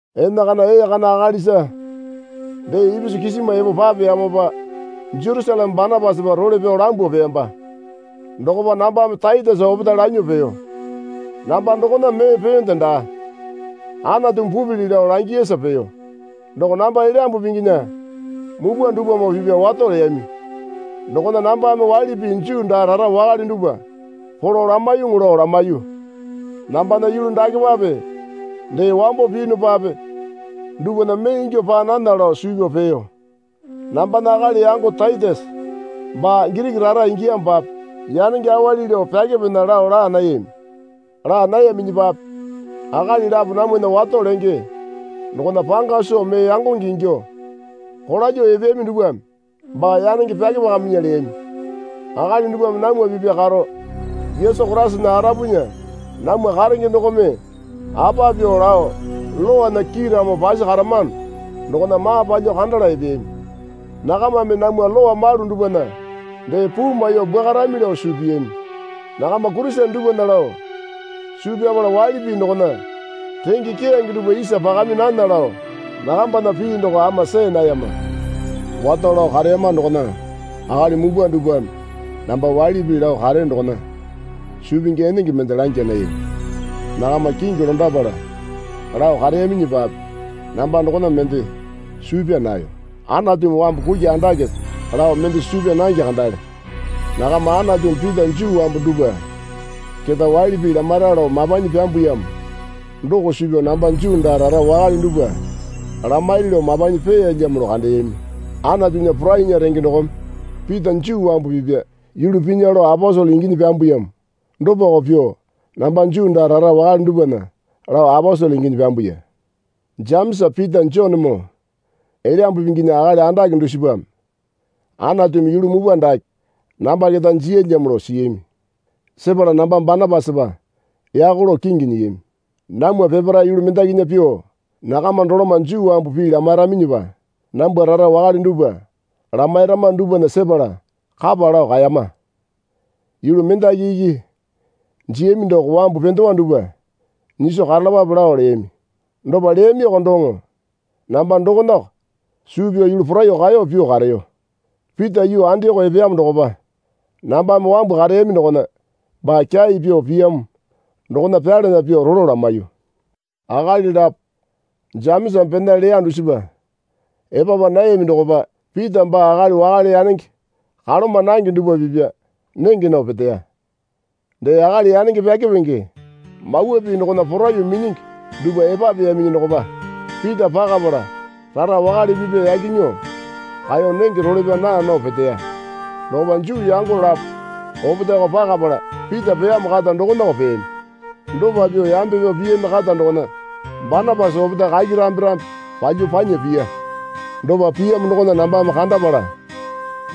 Enakana ee kana akalisa dee ipisu kisima epo papeyamopa Jerusaleme Banapasapa role pyao lambuo peyamba. Dokopa nambame Taitesa opetae lanyuo peyo. Namba dokona mee peyonde daa. Anatumi pupili lao langiyasa peyo. Doko namba Elyambu Pinginya mupwa dupwamoo pipya wato leyami dokona nambame waili pii Juu daa rara wakale dupwa polo lamaiyuŋu lao lamaiyu. Nambana yulu dakepape dee wambo piyunupape dupwana mee ingyuo paa nana lao suu pyao peyo. Nambana akali yango Taitesa baa Giriki rara ingiyamopape yanenge awali lao pyakepinya lao laa nayami. Laa nayaminyipape akali lapo namwana wato lenge dokona panga soo mee yangonge ingyuo kolalyuo epeyami dupwame baa yanenge pyakepakaminya leyami. Akali dupwame namwa pipya karo Yesu Koraisana arapunya namwa karenge dokome apa pyuo lao lowana kiiramo pasi karamano dokona maa palyuo kandala epeyami. Nakamame namwa lowa malu dupwana dee puu maiyuo bwuakarami lao suu piyami. Nakama Kurisene dupwana lao suu pyapala waili pii dokona renge keyange dupwa isa pakami nana lao nakambana pii doko ama see nayama. Wato lao kareyama dokona akali mupwa dupwame namba waili pii lao kareyo dokona suu pingi enenge mende langya nayami. (Nakama kingi londapala lao kareyaminyipape namba dokona mende suu pyaa nayo. Anatumi wambu kuki andakepe lao mende suu pyaa nange kandale.) Nakama Anatumi Pita Juu wambu dupwa keta waili pii lamaira lao mapanyi pyambuyamo doko suu pyao namba Juu daa rara wakale dupwa lamairi lao mapanyi peyalyamo lao kandeyami. Anatunya porainya renge dokome Pita Juu wambu pipya yulu pinya lao aposele inginyi pyambuyamo dopako pyuo namba Juu daa rara wakale dupwana lao aposele inginyi pyambuya. Jemesa Pita Jonemoo Elyambu Pinginya akali andake dusipame Anatumi yulu mupwa dake namba keta jiyalyamo lao siyami. Sepala namba Banapasapa yako lao kingi nyiyami. Namwa peparae yulu mendakinya pyuo nakama doloma Juu wambu pii lamairaminyipa nambwa rara wakale dupwa lamairama dupwana sepala kapa lao kaeyama. Yulu mendaki iki jiyami doko wambu pendewa dupwa nyiso karalapape lao leyami. Dopa leyamioko doŋo namba dokonako suu pyao yulu poraiyuo kaeyo pyuo kareyo. Pita yuu Andioko epeyamo dokopa nambame wambu kareyami dokona baa kyai pyuo piyamo dokona pyalana pyuo rolo lamaiyu. Akali lapo Jemesame pena leya dusipa epapa nayaminyi dokopa Pita baa akali wakale yanenge kaloma nange dupwa pipya nenge nao peteya. Dee akali yanenge pyakepenge mawa pii dokona porai minyingi dupwa epapeyaminyi dokopa Pita pakapala rara wakale pipya yaki nyuo kaeyo nenge role pyao naa nao peteya. Dokopa Juu yango lapo opetaeko pakapala Pita peyamo kata dokonako peyami. Dopa pyuo yambe pyao piyami kata dokona Banapasa opetae kaki rambe rambe palyuo panya piya. Dopa piyamo dokona nambame kandapala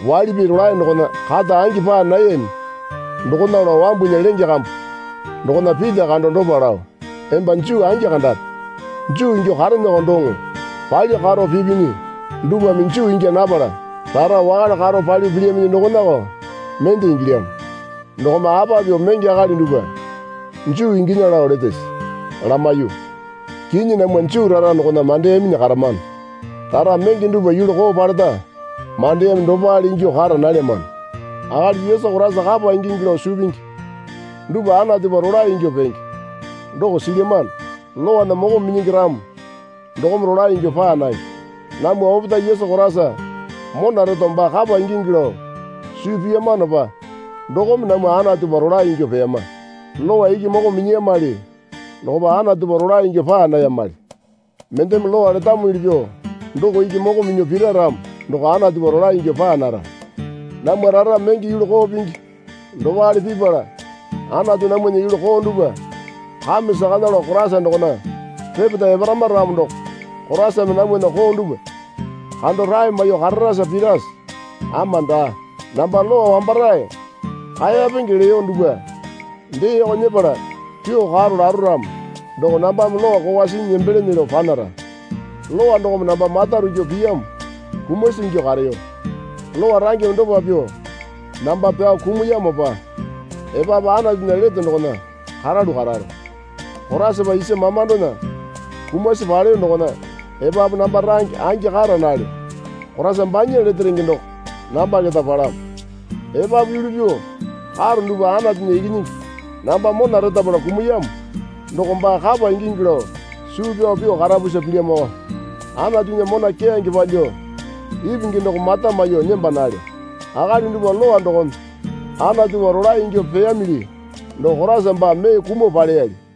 waili pii rolae dokona kata angi paa nayami dokona lao wambunya lenge kambu dokona Pita kando dopa lao, Emba Juu angi kandape. Juu ingyuo kareeneko doŋo palyuo karo pipinyi dupwame Juu ingya napala rara wakale karo palyuo pilyaminyi dokonako mende ingilyamo. Dokome apa pyuo menge akali dupwa Juu inginya lao letese? lamaiyu. Kinyi namwa Juu rara dokona mandeyaminyi karamano. Rara menge dupwa yulu koo paleta mandeyami dopale ingyuo kara nalyamano. Akali Yesu Koraisa kapa ingingi lao suu pingi dupwa Anatupa rolae ingyuo penge doko silyamano. Lowana moko minyingi ramo dokome rolae ingyuo paa nange. Namwa opetae Yesu Koraisa mona reto baa kapa ingingi lao suu piyamanopa dokome namwa Anatupa rolae ingyuo peyama. Lowa iki moko minyiyamali dokopa Anatupa rolae ingyuo paa nayamali. Mendeme Lowa letamuli pyuo doko iki moko minyuo pira ramo doko Anatupa rolae ingyuo paa nara. Namwa rara menge yulu koo pingi dopale pipala Anatu namwana yulu koo dupwa kame sakana lao Koraisa dokona repeta eparama ramo doko Koraisame namwana koo dupwa kando rae maiyuo kararasa pirase? Ama daa. Namba Lowa wambarae kaeyapenge leyo dupwa deeko nyepala pyuo karo laro ramo doko nambame Lowa kokwa sinyi nembelene lao panara. Lowa dokome namba mata rukyu piyamo kumasi ingyuo kareyo. Lowa rangeme dopa pyuo namba pyao kumuyamopa epapu Anatunya lete dokona karalu kararo. Koraisapa isa mamandona kumasi paleyo dokona epapu namba range angi kara nalyo. Koraisa banya lete renge doko namba keta palamo. Epapu yulu pyuo karo dupwa Anatunya Ikinyingi namba mona retapala kumuyamo doko baa kapa ingingi lao suu pyao pyuo karapusa pilyamoko. Anatunya mona keyange palyuo ipingi doko mata maiyuo nemba nalyo. Akali dupwa Lowa dokome Anatupa rolae ingyuo peyamili doko Koraisa baa mee kumuo paleyali.